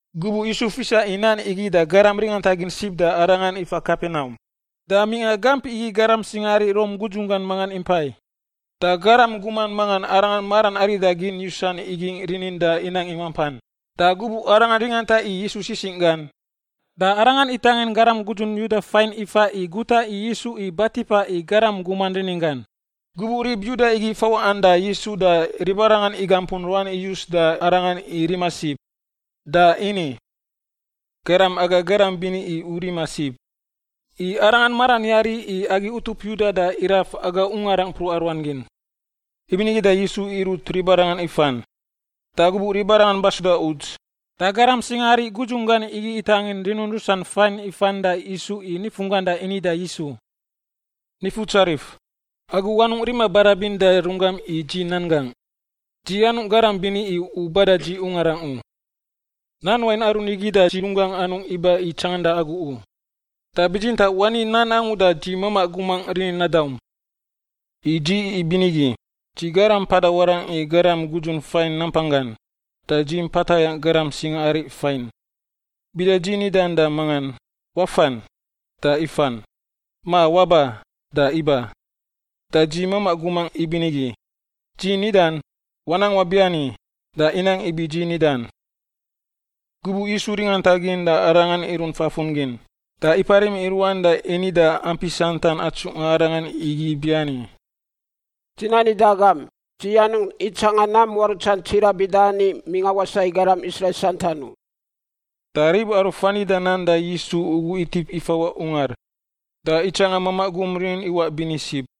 Gubuꞌ Yisu fisa i nan igi da garam ringantagin sib da Arangan ifa Kapenaum. Da mingꞌa gamp igi garam singaari Rom gudzunggan mangan impai, da garam guman mangan arangan maran arida gin yusan igingꞌ rinin da inang i mampan. Da gubuꞌ arangan ringanta i Yisu sisingꞌ gan, da arangan itangin garam gudzun Yuda fain ifa i guta i Yisu i batipa i garam guman rininggan. Gubuꞌ rib Yuda igi fawaꞌan da Yisu da ribarangan igampun ruan iyus da Arangan i rima sib, da ini, “Garam aga garam bini i u rima sib, i arangan maran yari i agi utup Yuda da iraf aga ungarangꞌ mpruꞌa ruan gin.” Ibinigi da Yisu irut ribarangan ifan. Da gubuꞌ ribarangan basuda uts, da garam singaari gudzunggan igi itangin rinun rusan fain ifan da isu i nifunggan da ini da Yisu, “Nifutsarif, agu anungꞌ rima barabin da runggam i dzi nan gangꞌ. Dzi anungꞌ garam bini i u bada dzi ungarangꞌ u. Nan wain aru nigi da dzi runggangꞌ anungꞌ iba i tsanganda agu u. Da bitsintaꞌ wani nan angu da dzi mamaꞌ gumangꞌ rinin nadaum. I dzi ibinigi, dzi garam mpada warangꞌ i garam gudzun fain nampanggan, da dzi mpa tayangꞌ garam singaari fain. Bida dzi nidan da mangan, ‘Wafan,’ da ifan, ma ‘Waba,’ da iba. Da dzi mamaꞌ gumangꞌ ibinigi, dzi nidan, ‘Wanang wabiani,’ da inang ibi dzi nidan.” Gubuꞌ Yisu ringantagin da Arangan irunt fafun gin, da iparim i ruan da ini da ampi santan atsungꞌa Arangan igi ibiani, “Dzi nani da agam, dzi anungꞌ itsanga nam muarutsan tsiraꞌ bida ani mingꞌa wasaꞌ i garam Israil santan u.” Da rib aru fa nida nan da Yisu ugu itip ifawaꞌ ungar, da itsanga mamaꞌ gum rinin iwaꞌ bini sib.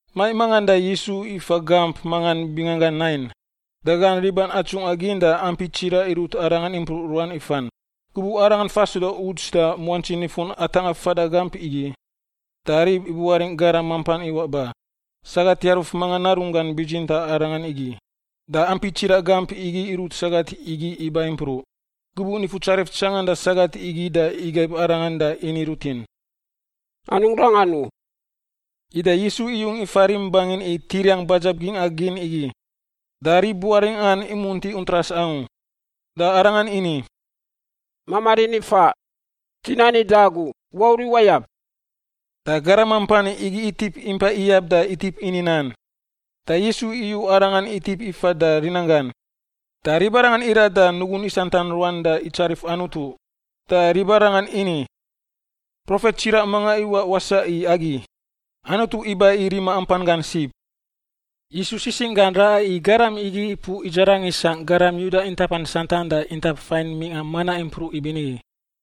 Maiꞌ mangan da Yisu ifa gamp mangan binganggan Nain, da gan riban atsungꞌa gin da ampi tsiraꞌ irut Arangan impruꞌ ruan ifan. Gubuꞌ Arangan fasuda uts da muantsi nifun atangꞌa fada gamp igi, da rib ibuaringꞌ garam mampan iwaꞌ ba. Sagat yaruf mangan narunggan bitsintaꞌ arangan igi. Da ampi tsiraꞌ gamp igi irut sagat igi iba impruꞌ. Gubuꞌ Nifutsarif tsanganda sagat igi da igaib arangan da ini rutin, “Anungꞌ rangan u.” Ida Yisu iyung ifa rim bangin i tiriang badzab gingꞌa gin igi, da rib buaringꞌan imunti untras angu. Da Arangan ini, “Mamaꞌ rini faꞌ, dzi nani da agu, wauriꞌ wayab.” Da garam mampan igi itip impai iyab da itip ini nan, da Yisu iyu arangan itip ifa da rinanggan. Da ribarangan irat da nugun isantan ruan da itsarif Anutu. Da ribarangan ini, “Profet tsiraꞌ mangan iwaꞌ wasaꞌ i agi. Anutu iba i rima ampan gan sib.” Yisu sisingꞌ gan raꞌa i garam igi ipuꞌ idzarang isangꞌ garam Yuda intapan santan da intap fain mingꞌa manaꞌ impruꞌ ibinigi.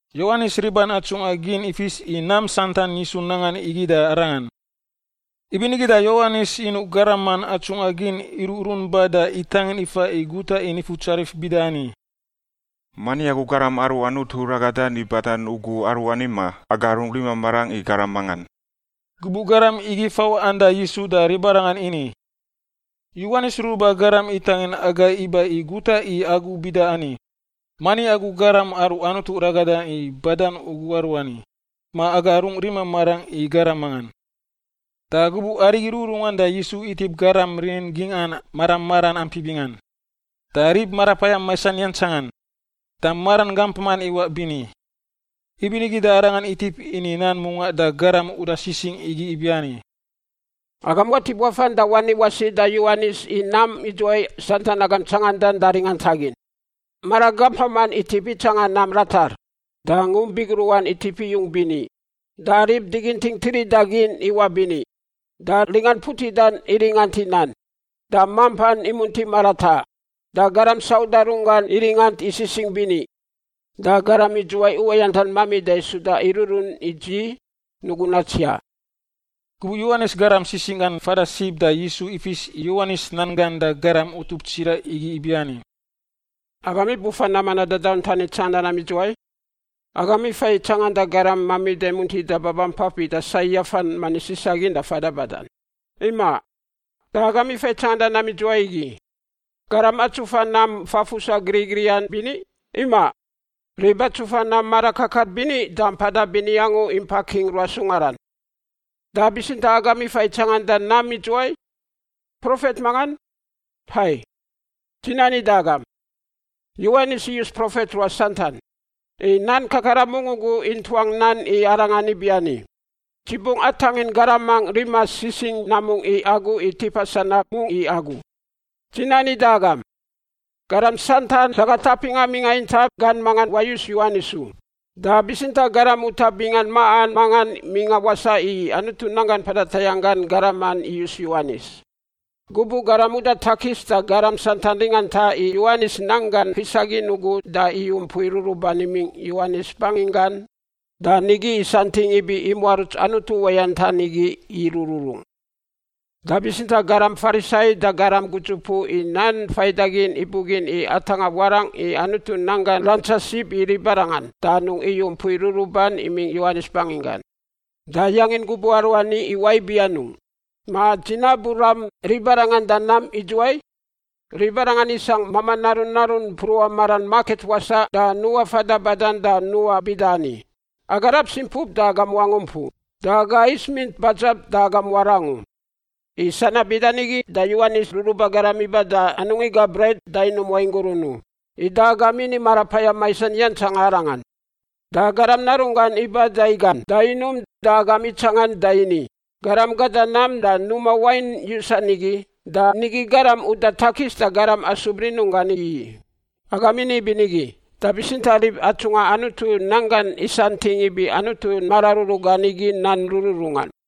Yowanis riban atsungꞌa gin ifis i nam santan Yisu nangan igi da arangan. Ibinigi da Yowanis inuꞌ garaman atsungꞌa gin iruꞌrun ba da itangin ifa i guta i Nifutsarif bida ani, “Mani agu Garam aru Anutu ragadan i badan ugu aruani, ma aga rungꞌ rima marangꞌ i garam mangan?” Gubuꞌ garam igi fawaꞌan da Yisu da ribarangan ini, “Yowanis Ruruba Garam itangin agai iba i guta i agu bida ani, ‘Mani agu Garam aru Anutu ragadan i badan ugu aruani, ma aga rungꞌ rima marangꞌ i garam mangan?’” Da gubuꞌ arigi rururungan da Yisu itip garam rinin gingꞌan mara maran ampi bingan, da rib marapayam maisan yantsangan, da maran gampaman iwaꞌ bini. Ibinigi da Arangan itip ini nan mungaꞌ da garam uda sisingꞌ igi ibiani, “Agam watip wafan da wani wasi da Yowanis i nam idzuwai santan agam tsangandan da ringantagin. Maran gampaman itip itsanga nam ratar, da ngump bigruꞌan itip iyung bini, da rib diginting tirida gin iwaꞌ bini, da ringan putidan iringant i nan, da mampan imunti marataꞌ, da garam sauda runggan iringant i Sisingꞌ Bini. Da garam idzuwai uwayantan mamida suda iruꞌrun i dzi, nugun natsiaꞌ.” Gubuꞌ Yowanis garam sisingꞌ gan fada sib da Yisu ifis i Yowanis nan gan da garam utup tsiraꞌ igi ibiani, “Agam ibufa nam manaꞌ dadauntan i tsanganda nam idzuwai? Agam ifa i tsanganda garam mamida muntida babampafan bida sai yafan manis isa gin da fada badan? Imaꞌ. Da agam ifa i tsanganda nam idzuwai igi, garam atsufa nam fafusan griꞌgriꞌan bini? Imaꞌ. Rib atsufa nam mara kakar bini da mpada bini angu impa king ruas ungaran. Da bitsintaꞌ agam ifa i tsanganda nam idzuwai? Profet mangan? Hai, dzi nani da agam, Yowanis iyus profet ruas santan. I nan kakaran mungꞌ ugu intuang nan i arangan ibiani, ‘Dzi bungꞌ atangin garamangꞌ rima sisingꞌ namungꞌ i agu i tipa sanab mungꞌ i agu.’ Dzi nani da agam, garam santan sagat apingꞌa mingꞌa intap gan mangan wayus Yowanis u. Da bitsintaꞌ garam utaꞌ bingan maꞌan mangan mingꞌa wasaꞌ i Anutu nanggan mpada tayangꞌ gan garaman iyus Yowanis. Gubuꞌ garam uda takis da garam santan ringanta i Yowanis nan gan fisa gin ugu da iyu mpui ruruban imingꞌ Yowanis banginggan da nigi isantingꞌ ibi imuaruts Anutu uwayantan igi irururung. Da bitsintaꞌ garam Farisai da garam gudzupuꞌ i nan faidagin ibugin i atangꞌa warangꞌ i Anutu nan gan rantsa sib i ribarangan, da anungꞌ iyu mpui ruruban imingꞌ Yowanis banginggan. Da yangin gubuꞌ aruani iwaꞌ ibi anungꞌ? Ma dzi nabu ram ribarangan da nam idzuwai? Ribarangan isangꞌ mamaꞌ narun narun mpruꞌa maran maket wasaꞌ da nuꞌa fada badan da nuꞌa bida ani, ‘Aga rab simpup da agam wangump u, da aga is mint badzab da agam warang u.’ I sanab bida nigi da Yowanis Ruruba Garam iba da anungꞌ iga bret da inum wain gurun u, ida agam ini marapayam maisan yantsanga arangan. Da Garam Narunggan iba da igan da inum da agam itsangan da ini, ‘Garam gada nam da numa wain yusan igi, da nigi garam uda takis da garam asub rinunggan igi i.’ Agam ini ibinigi, da bitsintaꞌ rib atsungꞌa Anutu nan gan isantingꞌ ibi Anutu mararuru gan igi nan rururungan.”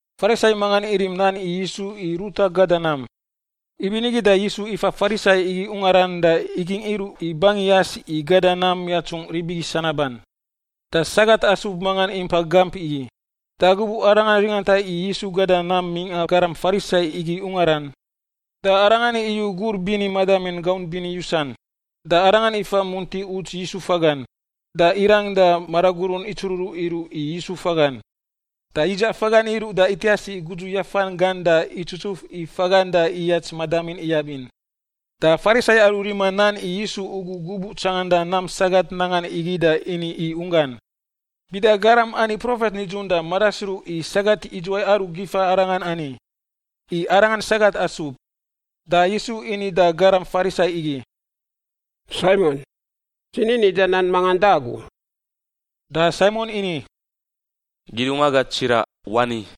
Farisai mangan irim nan i Yisu i ruta gada nam; ibinigi da Yisu ifa Farisai igi ungaran da igingꞌ iruꞌ i bangin yas i gada nam yatsungꞌ rib igi sanaban. Da sagat asub mangan impa gamp igi. Da gubuꞌ arangan ringanta i Yisu gada nam mingꞌa garam Farisai igi ungaran, da arangan iyu gur bini madamin gaunt bini yusan. Da arangan ifa munti uts Yisu fagan, da irang da maragurun itsururuꞌ iruꞌ i Yisu fagan. Da yidzaꞌ fagan iruꞌ da itias i gudzu yafan gan da itsutsuf i fagan da iyats madamin iyab in. Da Farisai aru rima nan i Yisu ugu gubuꞌ tsanganda nam sagat nangan igi da ini i unggan, “Bida garam ani profet nidzun da madasruꞌ i sagat idzuwai aru gifa arangan ani, i arangan sagat asub.” Da Yisu ini da garam Farisai igi, “Saimon, dzi ni nida nan mangan da agu.” Da Saimon ini, “Kidungwaga tsiraꞌ, wani.”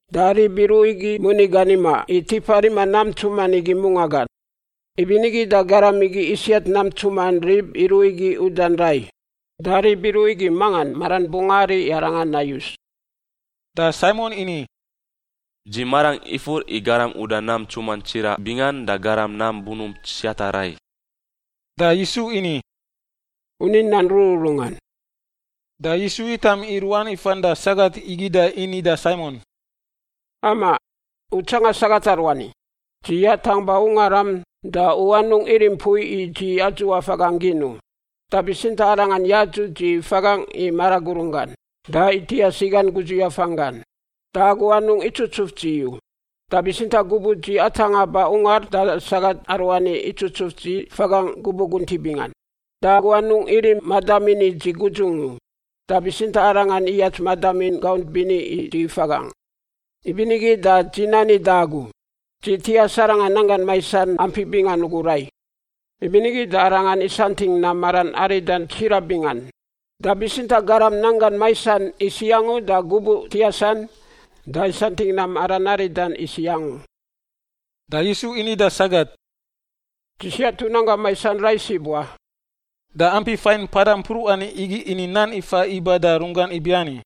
Da rib iruꞌ igi moni gan imaꞌ i tipa rima nam ntsuman igi mungaꞌ gan. Ibinigi da garam igi isiat nam ntsuman rib iruꞌ igi udan rai. Da rib iruꞌ igi mangan maran bungꞌ ari i arangan nayus?” Da Saimon ini, “Dzi marangꞌ ifur i garam uda nam ntsuman tsiraꞌ bingan da garam nam bunump siata rai.” Da Yisu ini, “U ni nan rururungan.” Da Yisu yitam i ruan ifan da sagat igi da ini da Saimon, “Amaꞌ, u tsanga sagat aruani? Dzi yatangꞌ ba ungaram da u anungꞌ irim mpui i dzi adzuꞌa fagangꞌ gin u. Da bitsintaꞌ arangan yadzuꞌ dzi fagangꞌ i maragurun gan, da itias i gan gudzu yafan gan. Da agu anungꞌ itsutsuf dzi u, da bitsintaꞌ gubuꞌ dzi atangꞌa ba ungar da sagat aruani itsutsuf dzi fagangꞌ gubuꞌ guntiꞌ bingan. Da agu anungꞌ irim madamin i dzi gudzungꞌ u, da bitsintaꞌ arangan iyats madamin gaunt bini i dzi fagangꞌ. Ibinigi da dzi nani da agu, dzi tias arangan nanggan maisan ampi bingan ugu rai, ibinigi da arangan isantingꞌ nam maran aridan tsiraꞌ bingan. Da bitsintaꞌ garam nanggan maisan isiꞌ angu da gubuꞌ tiasan, da isantingꞌ nam maran aridan isiꞌ angu.” Da Yisu ini da sagat, “Dzi siat u nanggam maisan rai sib wa.” Da ampi fain mpada mpruꞌan igi ini nan ifa iba da runggan ibiani,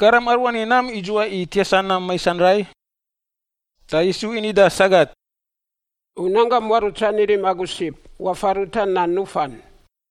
“Garam aruani nam idzuwai i tiasa nam maisan rai?” Da Yisu ini da sagat, “U nanggam muarutsan irim agu sib. Wafan ruta nan nufan.”